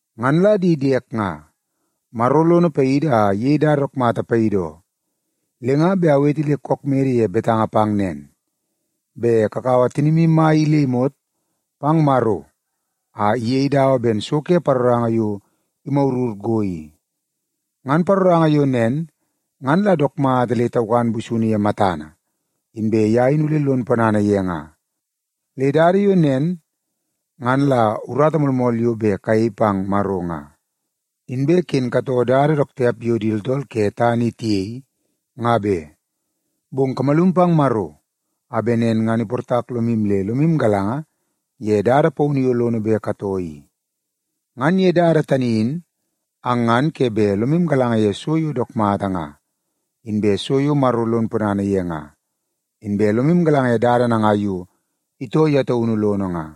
Ngan la di diek nga, Maro lono paidi a iyei dada dook mata paidi oo, le nga bet awete le kook mede ye betanga pang nen, bet kakaua tinimu mai in le imot pang Maro a iyei dawa ben so ke paroranga yo imagurur go i. Ngan paroranga yo nen ngan la dook mata le taukan busunu ye matana, inbe ye in ole lon ponana ye nga. Le dada yo nen ngan la urata moolmool yo bet kayei pang Maro nga. Inbe ken katoo dada dook tiap yo di tooltool ke tana i tiyei, nga be. Bong kamalum pang Maro a bet nen ngan iportak lomu le lomu galanga ye dada paunu yo lono bet katoo i. Ngan ye dada tani in ang ngan ke bet lomu galanga ye so yo dook mata nga, inbe so yo Maro lon ponana ye nga, inbe lomu galanga ye dada nangai yo itoo ye taunu lono nga.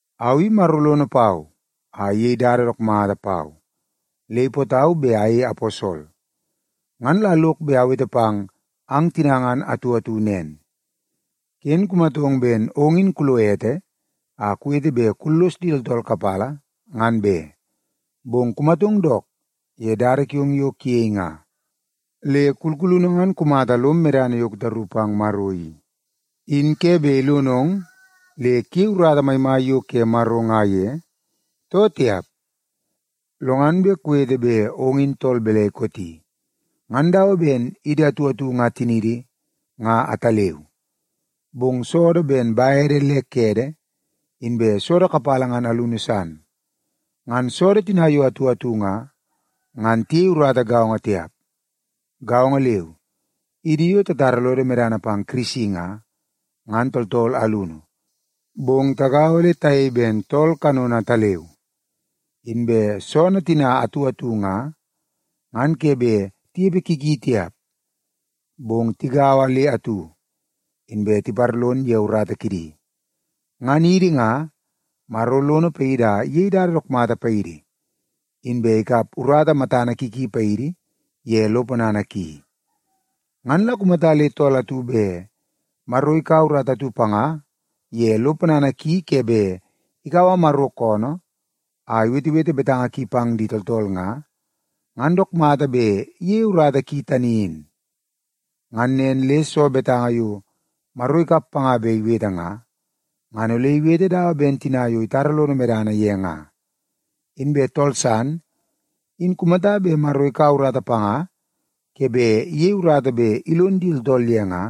Au i Maro lono pau a iyei dada dook mata pau, le ipootau bet ayei aposol. Ngan la lok bet awete pang ang tina ngan atu atu nen: Ken kumatong ben ong in kulo ete a kuwete bet kullos di tooltool kapala, ngan be, bong kumatong dook ye dada kiong yo kuyei nga. Le kulkulunu ngan kumata lom medana yo kutaru pang Maro i, in ke bet ilonong le kuyei urata maimai yo ke Maro nga ye, too tiap? Lo ngan bet kuwete bet ong in tool balai kooti. Ngan dawa ben idi atu atu nga tiniidi nga ataleu, bong soodoo ben bede le kede inbe soodoo kapala ngan alunu san. Ngan soodoo tina yo atu atu nga, ngan tiyei urata gaongo tiap. Gaongo leu, idi yo tatara lodo medana pang Kirisi nga, ngan tooltool alunu, bong tagaua le tayei ben tool kanono ataleu. Inbe soonoo tina atu atu nga, ngan ke bet tinepe ki ki tiap, bong tigaua le atu, inbe tiparlon ye urata kidi. Ngan idi nga, Maro lono paidi a iyei dada dook mata paidi, inbe ikap urata matana ki ki paidi ye lo ponana ki. Ngan la kumata le tool atu bet Maro ikaua urata atu panga ye lo ponana ki ke bet ikaua Maro koonoo a iwetewete betanga ki pang di tooltool nga, ngan dook mata bet iyeie urata ki tani in. Ngan nen le soo betanga yo Maro ikap panga bet iwete nga, ngan ole iwete dawa ben tina yo itara lono medana ye nga. Inbe tool san in kumata bet Maro ikaua urata panga ke bet iyei urata bet ilon di tooltool ye nga,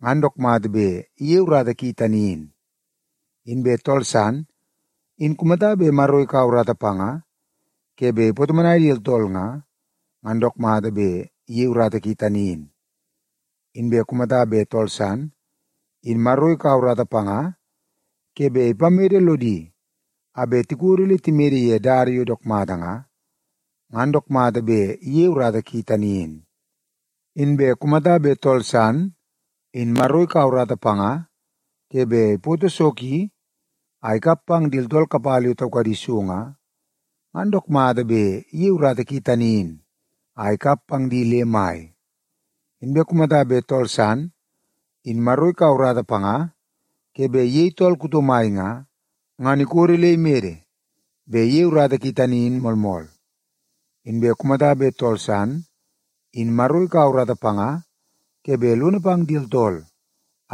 ngan dook mata bet iyeie urata ki tani in. Inbe tool san in kumata bet Maro ikaua urata panga ke bet ipatomonai di tooltool nga, ngan dook mata bet iyeie urata ki tani in. Inbe kumata bet tool san, in Maro ikaua urata panga ke bet ipamede lodi a bet tikodo le timede ye dada yo dook mata nga, ngan dook mata bet iyeie urata ki tani in. Inbe kumata bet tool san, in Maro ikaua urata panga ke bet ipoto so ki a ikap pang di tooltool kapala yo taukadi so nga, ngan dook mata bet iyeie urata ki tani in a ikap pang di le mai. Inbe kumata bet tool san, in Maro ikaua urata panga ke bet iyei tool kuto mai nga, ngan ikodo le imede bet iyeie urata ki tani in moolmool. Inbe kumata bet tool san, in Maro ikaua urata panga ke bet lono pang di tooltool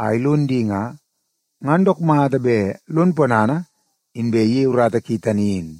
a ilon di nga, ngan dook mata bet lon ponana inbe iyeie urata ki tani in.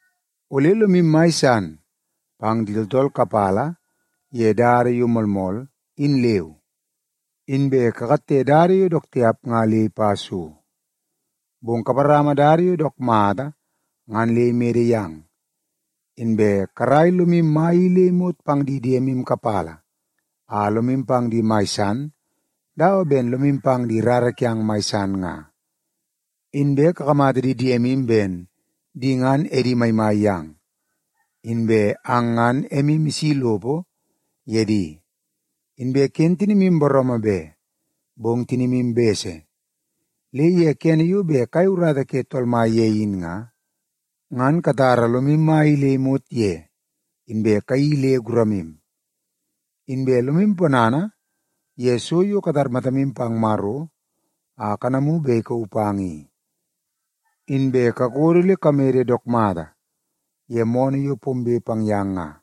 Ole lomu mai san pang di tooltool kapala ye dada yo moolmool, in leu. Inbe kakatte dada yo dook tiap nga le ipa so, bong kaparama dada yo dook mata ngan le imede yang. Inbe karaia lomu mai i le imot pang di diemu kapala a lomu pang di mai san dawa ben lomu pang di rara kiang mai san nga. Inbe kakamata di diemu ben di ngan edi maimai yang, inbe ang ngan emu isi lopo ye di. Inbe ken tinimu booroomoo be, bong tinimu bese. Le ye kene yo bet kayei urata ke Tool Mai ye in nga, ngan katara lomu mai i le imot ye inbe kayeii le guramu. Inbe lomu ponana ye so yo katar matamu pang Maro a kanamu bet ikauu pang i. Inbe kakodo le kamede dook mata ye moonoo yo pombe pang yang nga.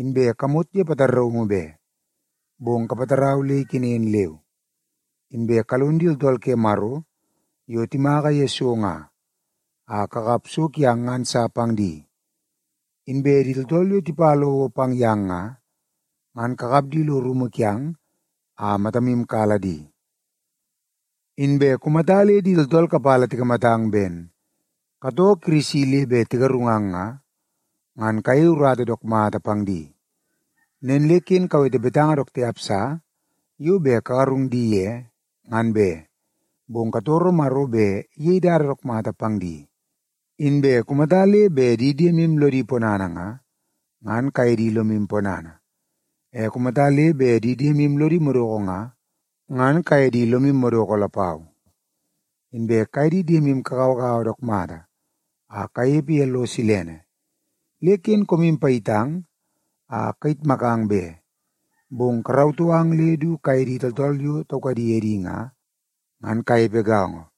Inbe kamot ye pataraungu be, bong kapatarau le ikenen leu. Inbe kalon di tooltool ke Maro yo timaka ye so nga, a kakap so kiang ngan sa pang di. Inbe di tooltool yo tipa lowo pang yang nga, ngan kakap di lo rumu kiang a matamu kala di. Inbe kumata le di tooltool kapala tikamatang ben katoo Kirisi le bet tigarungang nga, ngan kayei urata dook mata pang di. Nen le ken kawete betanga dook tiap sa yo bet kagarung di ye, ngan be, bong katoro Maro bet iyei dada dook mata pang di. Inbe kumata le bet di diemu lodi ponana nga, ngan kaye di lomu ponana. E kumata le bet di diemu lodi madoko nga, ngan kaye di lomu madoko lapau. Inbe kaye di diemu kagauagaua dook mata a kanepe ye lo silene. Le ken koomu payitang a kayitmakang be, bong karautoo ang le du kaye di tooltool yo taukadi edi nga, ngan kanepe gaongo.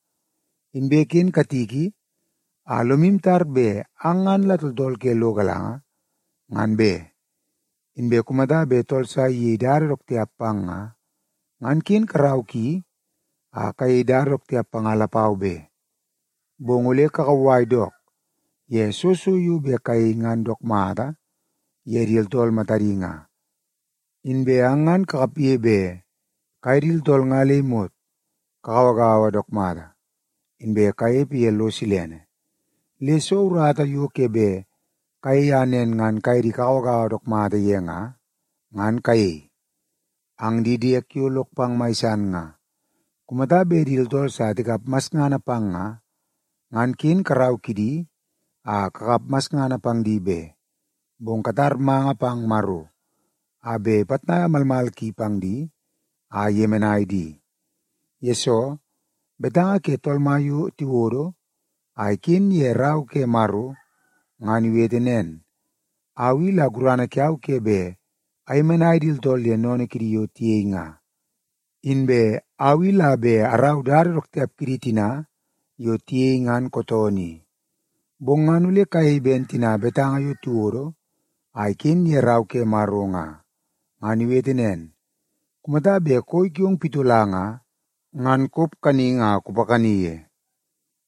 Inbe ken katiki a lomu tar bet ang ngan la tooltool ke lo galanga, ngan be. Inbe kumata bet tool sa iyei dada dook tiap pang nga, ngan ken karau ki a kayei dada dook tiap panga lapau be. Bong ole kakauwai dook ye soo so yo bet kayei ngan dook mata ye di tooltool matadi nga. Inbe ang ngan kakapge bet kaye di tooltool nga le imot kagauagaua dook mata, inbe kanepe ye lo silene. Le soo urata yo ke bet kayei a nen ngan kaye di kagauagaua dook mata ye nga, ngan kayei. Ang di diek yo lok pang mai san nga, kumata bet di tooltool sa tikap masngana pang nga, ngan ken karau kidi a kakap masngana pang di be. Bong katar manga pang Maro a bet ipitnaia malmal ki pang di a iyemenai di. Yesoo, betanga ke Tool Mai yo tiwodo a iken ye Rau ke Maro ngan iwete nen, “Au i la gurana kiau ke bet ayemenai di tooltool ye sennene kidi yo tiyei nga. Inbe au i la bet arau dada dook tiap kidi tina yo tiyei ngan kootoonoo i.” Bong ngan ole kayei ben tina betanga yo tiwodo a iken ye Rau ke Maro nga. Ngan iwete nen, “Kumata bet koi kiong pitola nga, ngan kop kaningi a kupakani ye;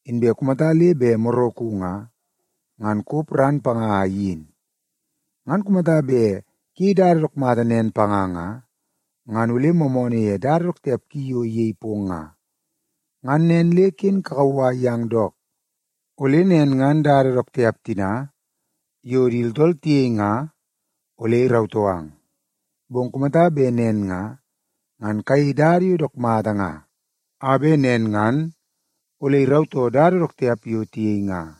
inbe kumata le bet moraku nga, ngan kop ran panga a iyin. Ngan kumata bet kuyei dada dook mata nen panga nga, ngan ole moomoonoo ye dada dook tiap ki yo iyei pong nga.” Ngan nen le ken kakauwai yang dook, ole nen ngan dada dook tiap tina yo di tooltool tiyei nga ole irautoo ang. Bong kumata bet nen nga, ngan kayei dada yo dook mata nga, a bet nen ngan ole irautoo dada dook tiap yo tiyei nga.